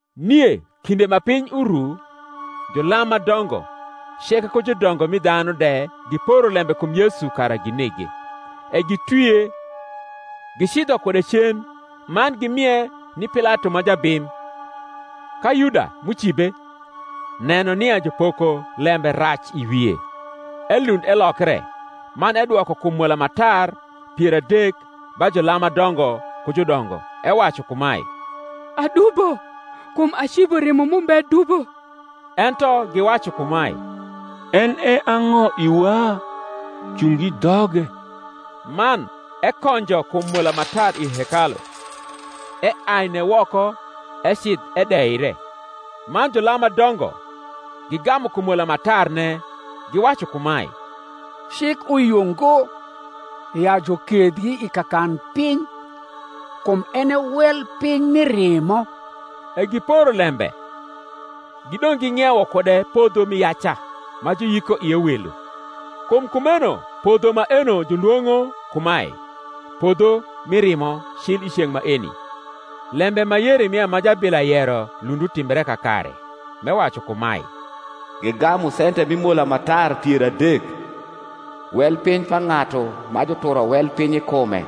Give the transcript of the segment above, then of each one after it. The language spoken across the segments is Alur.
Nie kinde ma piny uru, julam ma dongo ceke ku judongo mi dhanu de giporo lembe kum Yesu kara ginege: e gitwie, gicidho kude cen, man gimie ni Pilato ma jabim. Ka Yuda, m’ucibe, neno nia jupoko lembe rac i wie, elund elokre, man edwoko kum mola ma tar pier adek ba julam ma dongo ku judongo, ewacu kumae, Adubo kum acibo rimo m’umbe dubo. Ento giwacu kumae, En e ang’o iwa? cung i dhoge. Man ekonjo kum mola ma tar i hekalu, eaine woko; ecidh edeire. Man julam ma dongo gigamu kum mola ma tarne, giwacu kumae, Cik uyio ngo ya jukethgi i kakanpiny, kum en e wel piny mi rimo. E giporo lembe, gidong’ ging’iewo kude podho mi yaca, ma juyiko ie welo. Kum kumeno podho maeno julwong’o kumae, Podho mi rimo, cil i ceng’ maeni. Lembe ma Yeremia ma jabila yero lund utimbre kakare, m’ewacu kumae, Gigamu sente mi mola ma tar pier adek, wel piny pa ng’atu ma juturo wel piny i kume,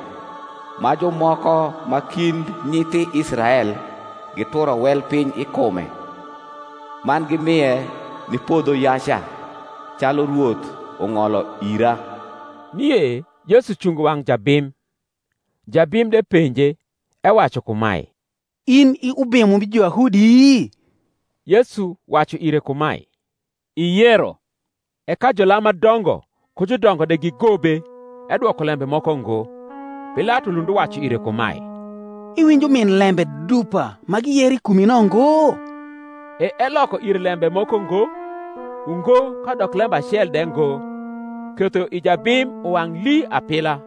ma jumoko ma kind nyithi Israel gituro wel piny i kume; man gimie ni podho yaca, calu Rwoth ung’olo ira. Nie Yesu cungo wang’ jabim: jabim de penje, ewacu kumae, In i Ubimo mi Juyahudi? Yesu wacu ire kumae, Iyero. E ka julam ma dongo ku judongo de gigobe, edwoko lembe moko ngo. Pilato lund uwacu ire kumae, Iwinjo min lembe dupa ma giyero i kurni no ngo? E eloko ire lembe moko ngo, ungo kadok lembe acel de ngo: ketho i jabim uwang’ lii apila.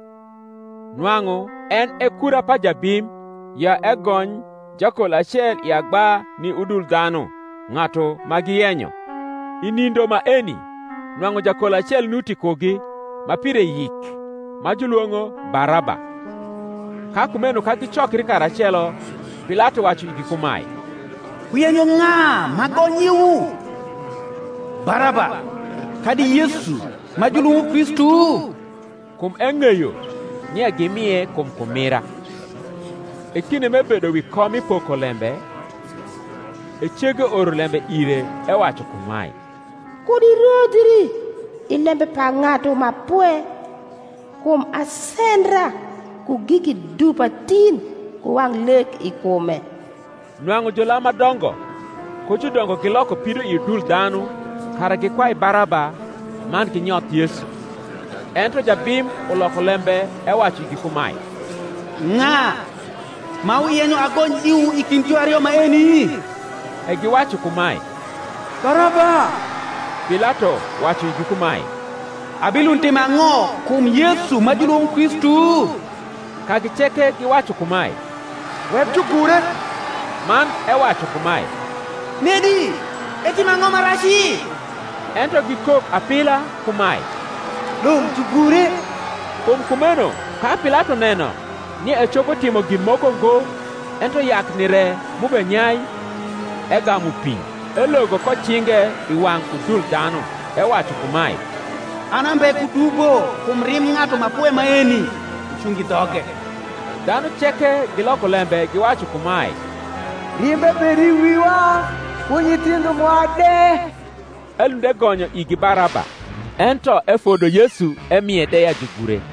Nwang’u en e kura pa jabim ya egony jakol acel i agba ni udul dhanu, ng’atu ma giyenyo. I nindo maeni nwang’u jakol acel nuti kugi, ma pire yik, ma julwong’o Baraba. Ka kumeno ka gicokri karacelo, Pilato wacu igi kumae, Wuyenyo ng’a m’agony iwu? Baraba, kadi Yesu ma julwong’o Kristu? Kum eng’eyo nia gimie kum kumira. E kinde m’ebedo wi kom mi pokolembe, e cege oro lembe ire, ewacu kumae, Kud irodhii i lembe pa ng’atu ma pwe; kum asendra ku giki dupa tin ku wang’ lek i kume. Nwang’u julam ma dongo ku judongo giloko pido i udul dhanu kara gikwai Baraba, man ginyoth Yesu. Ento jabim uloko lembe ewacu igi kumae, Ng’a ma wuyenyo agony iwu i kind juario maeni? E giwacu kumae, Baraba. Pilato wacu igi kumae, Abilund timo ang’o kum Yesu ma julwong’o Kristu? Kagi ceke giwacu kumae, Wek jugure. Man ewacu kumae, Nedi, etimo ang’o ma raci? Ento gikok apila kumae, Dong’ jugure. Kum kumeno ka Pilato neno nia ecopo timo gin moko ngo, ento yakni re m’ubenyai, egamu pi, elogo ko cinge i wang’ udul dhanu, ewacu kumae, An ambe ku dubo kum rimb ng’atu ma pwe maeni; wucung i dhoge. Dhanu ceke giloko lembe giwacu kumae, Rimbe bed i wiwa, ku nyithindho mwa de. Elund egonyo igi Baraba; ento efodo Yesu emie de ya jugure.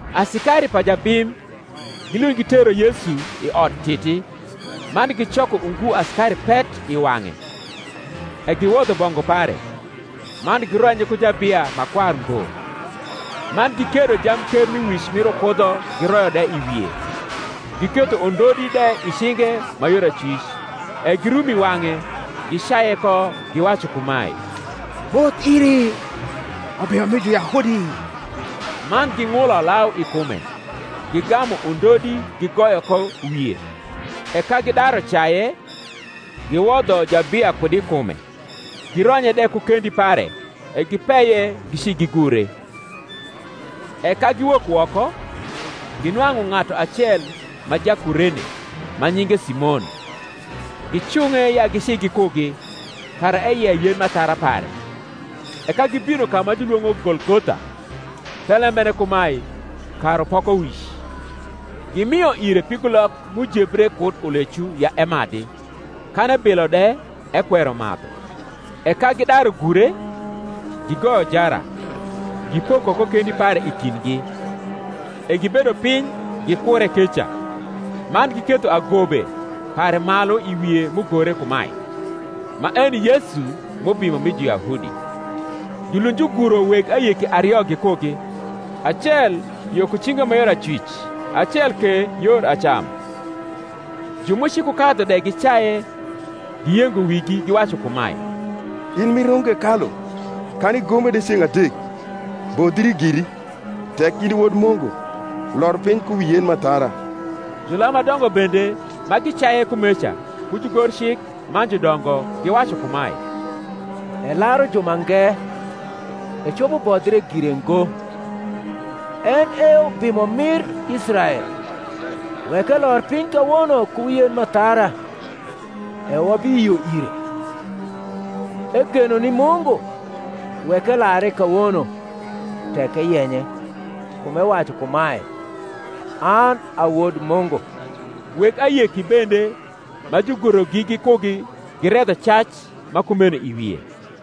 Asikari pa jabim gilund gitero Yesu i Odtiti, man gicoko ungu asikari pet i wang’e. E giwodho bongu pare, man gironye ku jabia ma kwar ngbo. Man gikiedo jamkermiwic mir ukudho giroyo de i wie, giketho undodi de i cinge ma yor acwic; e girum i wang’e, gicaye ko, giwacu kumae, Moth iri, Ubimo mi Juyahudi! Man ging’ulo lau i kume, gigamu undodi gigoyo ko wie. E ka gidaru caye, giwodho jabia kud i kume, gironye de ku kendi pare, e gipeye gici gigure. E ka giwok woko, ginwang’u ng’atu acel ma Jakurene, ma nyinge Simon: gicung’e ya gici gikugi, kara eyei yen m’athara pare. E ka gibino ka ma julwong’o Golgotha, thelembene kumae, Karupokowic, gimio ire pigulok m’ujebre kud ulecu ya emadhi: kan ebilo de, ekwero madhu. E ka gidaru gure, gigoyo jara, gipoko ko kendi pare i kindgi; e gibedo piny gikure keca. Man giketho agobe pare malu i wie m’ugore kumae, MAENJ YESU M’UBIMO MI JUYAHUDI. Julund juguro weg ayeki ario gikugi, acel yo ku cinge ma yor acwic, acel ke yor acam. Ju m’ucikukadhu de gicaye, giyengo wigi, giwacu kumae, In m’irungo hekalu, kan igome de ceng’ adek, bodhii giri: tek in i Wod Mungu, lor piny ku wi yen m’athara. Julam ma dongo bende ma gicaye kumeca, ku jugorcik man judongo, giwacu kumae, Elaru jumange; ecopo bodhie gire ngo. En e Ubimo mir Israel; wek elor piny kawono ku wi yen m’athara, e wabiyio ire. Egeno ni Mungu; wek elare kawono, tek eyenye: kum ewacu kumae, An a Wod Mungu. Weg ayeki bende ma jugurogi gikugi giredho cac ma kumeno i wie.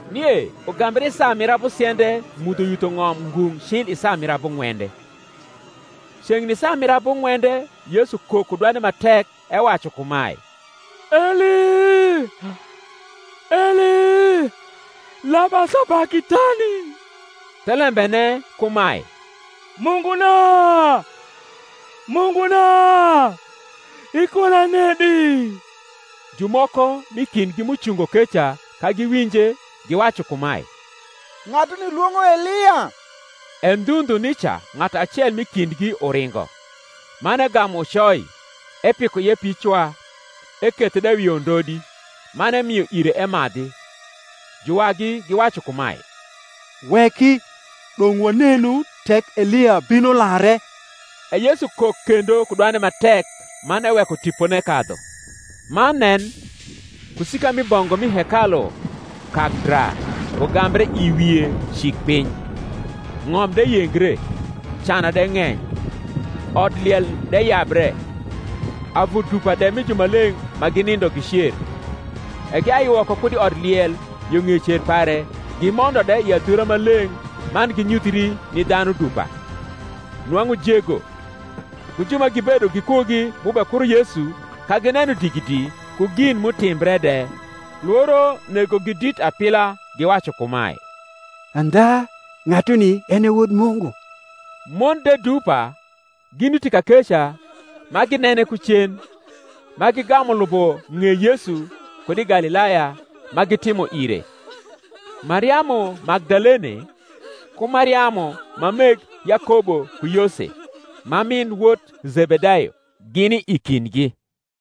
Nie ugambre i saa mir abusiende mudho yutho ng’om ngung’ cil i saa mir abung’wende. Ceng’ni saa mir abung’wende Yesu kok ku dwande ma tek, ewacu kumae, Eli, Eli, lama sabakithani? thelembene kumae, Munguna, Munguna, ikuna nedi? Jumoko m’i kindgi m’ucungo keca, ka giwinje, giwacu kumae, Ng’atuni lwong’o Elia. E ndhu ndhu nica ng’atu acel m’i kindgi uringo, man egamu ucoi, epiko ie picwa, ekethe de wi undodi, man emio ire emadhi. Juwagi giwacu kumae, Weki; dong’ wanenu tek Elia bino lare. E Yesu kok kendo ku dwande ma tek, man eweko tipone kadhu. Man nen, kusika mi bongu m’i hekalu kak dra ugambre i wie cik piny; ng’om de yengre; cana de ng’eny; odliel de yabre; avu dupa de mi jumaleng’ ma ginindo gicer; E giai woko kud i odliel yo ng’ei cer pare gimondo de i adhura ma leng’ man ginyuthri ni dhanu dupa. Nwang’u jego, ku ju ma gibedo gikugi m’ubekuro Yesu, ka gineno digidi, ku gin m’utimbre de, lworo negogi dit apila, giwacu kumae, Andha ng’atuni en e Wod Mungu. Mon de dupa ginuti kakeca ma ginene ku cen, ma gigamu lubo ng’ei Yesu kud i Galilaya, ma gitimo ire: Mariamu Magdalene, ku Mariamu ma meg Yakobo ku Yose, ma min wot Zebedayo gini i kindgi.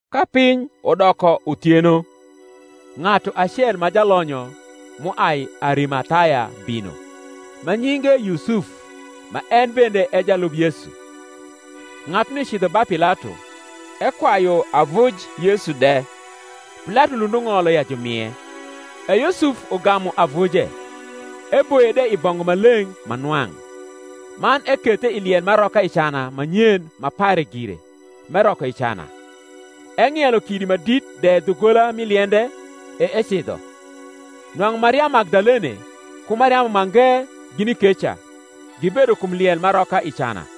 Ka piny udoko uthieno, ng’atu acei ma jalonyo m’uai Arimathaya bino, ma nyinge Yusuf, ma en bende e jalub Yesu: ng’atuni cidho ba Pilato, ekwayu avuj Yesu de. Pilato lund ung’olo ya jumie. E Yusuf ugamu avuje, eboye de i bongu ma leng’ ma nwang’, man ekethe i liel m’aroka i cana ma nyen ma pare gire, m’eroko i cana: eng’ielo kidi ma dit de dhugola mi liende, e ecidho. Nwang’u Mariamu Magdalene, ku Mariamu mange, gini keca, gibedo kum liel m’aroka i cana.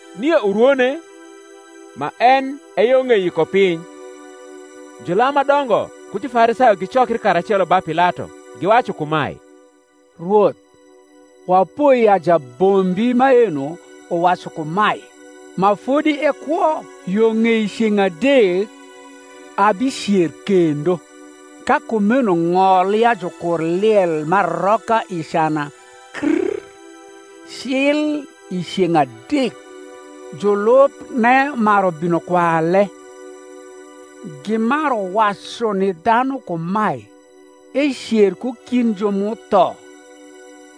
Nie urwone, ma en e yo ng’ei Yikopiny, julam ma dongo ku Jufarisayo gicokri karacelo ba Pilato, giwacu kumae, Rwoth, wapoi ya jabombi maeno wacu kumae, ma fodi ekwo, Yo ng’ei ceng’ adek abicer kendo. Ka kumeno ng’ol ya jukur liel m’aroka i cana krr cil i ceng’ adek, julubne maru bino kwale, gimaru wacu ni dhanu kumae, Ecer ku kind ju m’utho: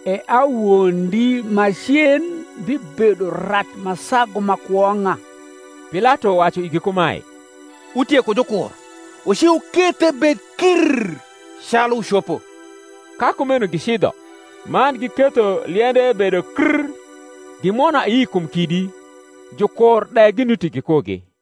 e awondi ma cen bibedo rac ma sagu ma kwong’a. Pilato wacu igi kumae, Wutie ku jukur: wuci wukethe bed krr calu wucopo. Ka kumeno gicidho, man giketho liende bedo krr, gimwono ayi kum kidi, jukur de ginuti gikugi.